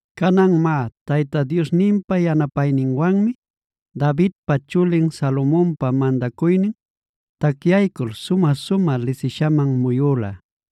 Canan má, Tayta Diosninpa yanapayninwanmi Davidpa chulin Salomonpa mandacuynin tacyaycul sumä-sumä lisishaman muyüla.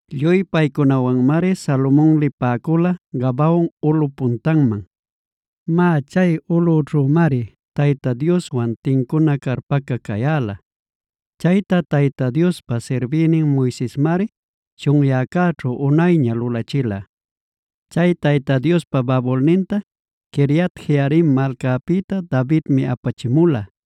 Lluy paycunawanmari Salomon lipäcula Gabaon ulꞌup puntanman. Má, chay ulꞌućhümari Tayta Dioswan tincuna carpaca cayäla. Chayta Tayta Diospa sirbïnin Moisesmari chunyäcäćhu unayña lulachila. Chay Tayta Diospa babulninta Quiriat-jearim malcapïta Davidmi apachimula,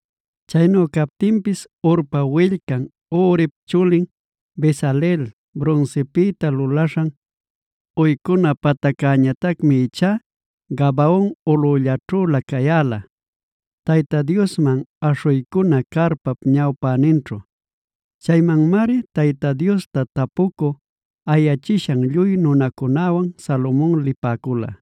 Chaynu captinpis Hurpa willcan Urip chulin Bezaleel brunsipïta lulaśhan uycuna pataccäñatacmib ichá Gabaon ulꞌullaćhülä cayäla, Tayta Diosman aśhuycuna carpap ñawpäninćhu. Chaymanmari Tayta Diosta tapucü ayachishan lluy nunacunäwan Salomon lipäcula.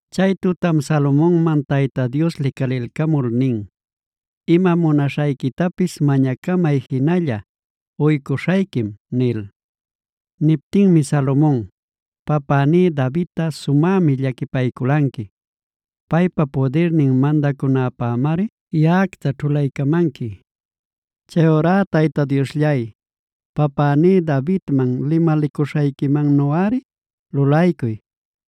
Chay tutam Salomonman Tayta Dios licalilcamul nin: “Ima munaśhayquitapis mañacamay jinalla, uycuśhayquim” nil. Niptinmi Salomon: “Papäní Davidta sumämi llaquipayculanqui. Paypa pudirnin mandacunäpämari yaꞌacta ćhulaycamanqui. Chayurá Tayta Diosllay, papäní Davidman limalicuśhayquimannuꞌari lulaycuy.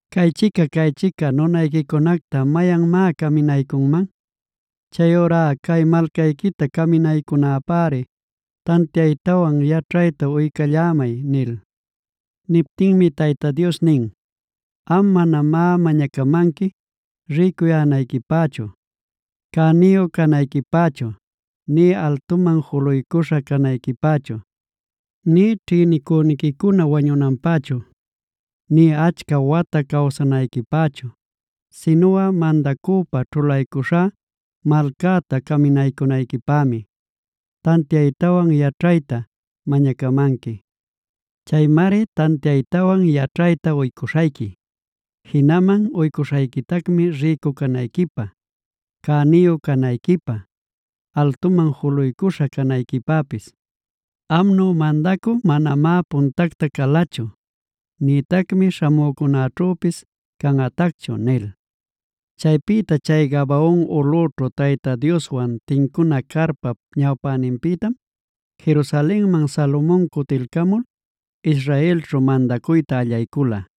¿¡Caychica-caychica nunayquicunacta mayanmá caminaycunman!? Chayurá cay malcayquita caminaycunäpäri tantiaytawan yaćhayta uycallämay” nil. Niptinmi Tayta Dios nin: “Am manamá mañacamanqui rïcuyänayquipächu, cäniyu canayquipächu, nï altuman juluycuśha canayquipächu, nï ćhïnicüniquicuna wañunanpächu, nï achca wata cawsanayquipächu sinuꞌa mandacüpa ćhulaycuśhá malcäta caminaycunayquipämi tantiaytawan yaćhayta mañacamanqui. Chaymari tantiaytawan yaćhayta uycuśhayqui. Jinaman uycuśhayquitacmi rïcu canayquipä, cäniyu canayquipä, altuman juluycuśha canayquipäpis. Amnu mandacü manamá puntacta calachu nïtacmi śhamücunäćhüpis canꞌatacchu” nil. Chaypïta chay Gabaon ulꞌüćhu Tayta Dioswan tincuna carpap ñawpäninpïtam, Jerusalenman Salomon cutilcamul Israelćhu mandacuyta allaycula.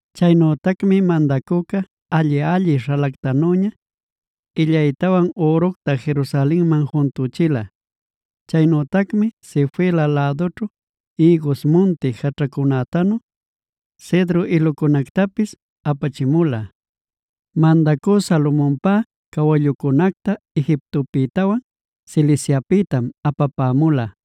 Chaynütacmi mandacüca alli-alli śhalactanüña illaytawan üructa Jerusalenman juntüchila.e Chaynütacmi Sefela lädućhu ïgus munti jaćhacunätanu cedro ilucunactapis apachimula. Mandacü Salomonpä cawallucunacta Egiptopïtawanf Ciliciapïtamg apapämula.